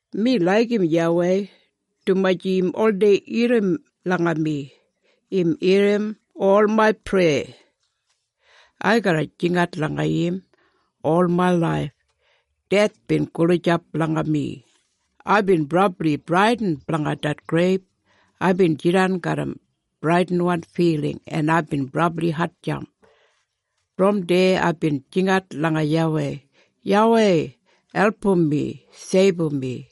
Mi laigim YAWEI, dumaji im oldei irrim langa mi. Im irrim ol main preya. Ai garra jingat langa im ol main laif. Deth bin gulijap langa mi. Aibin brabli bradin blanga det greib. Aibin jidan garram bradinwan filing en aibin brabli hatjamp. Brom deya aibin jingat langa YAWEI, “YAWEI, album mi! Seibum mi!”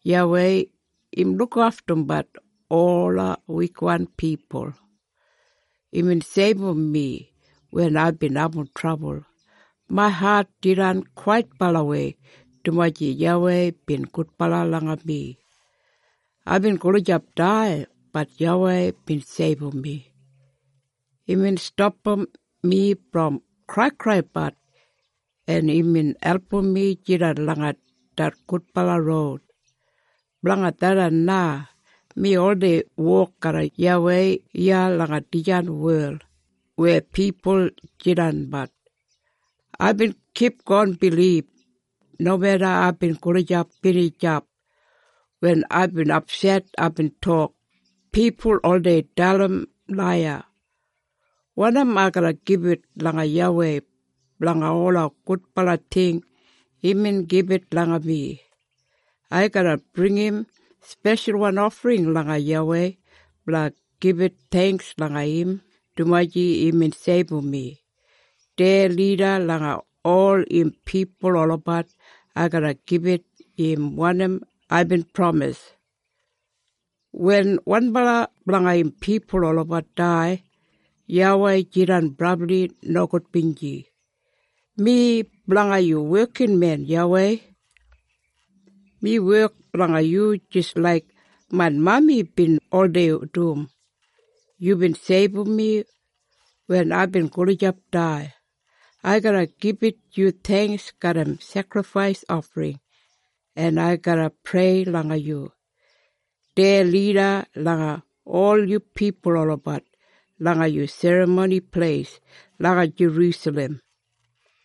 YAWEI im lukaftumbat ola wikwan pipul. Imbin seibum mi wen aibin abum trabul. Main hat jidan kwaitbalawei, dumaji YAWEI bin gudbala langa mi. Aibin gulijap dai, bat YAWEI bin seibum mi. Imbin stapam mi brom kraikraibat, en imbin album mi jidan langa det gudbala roud. Blanga tharran na mi oldei wok garram YAWEI iya langa dijan wel weya pipul jidanbat. Aibin kipgon bilib, nomeda aibin gulijap binijap. Wen aibin apset aibin tok, “Pipul oldei dalim laiya.” Wanim ai garra gibit langa YAWEI blanga ola gudbala ting imbin gibit langa mi? Ai garra bringim speshalwan ofring langa YAWEI blanga gibit theingks langa im dumaji imbin seibum mi. Deya lida langa ol im pipul olabat ai garra gibit im wanim aibin pramis. Wen wanbala blanga im pipul olabat dai, YAWEI jidan brabli nogudbinji. Mi blanga yu wekinmen, YAWEI. Mi wek blanga yu jis laik main mami bin oldei dum. Yubin seibum mi wen aibin gulijap dai. Ai garra gibit yu theingks garram sekrifais ofring, en ai garra prei langa yu. Deya lida langa ol yu pipul olabat langa yu Serramoni Pleis langa Jerusalem,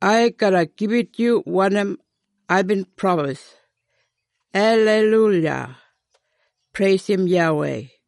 ai garra gibit yu wanim aibin pramis. Aleiluya! Preisim YAWEI!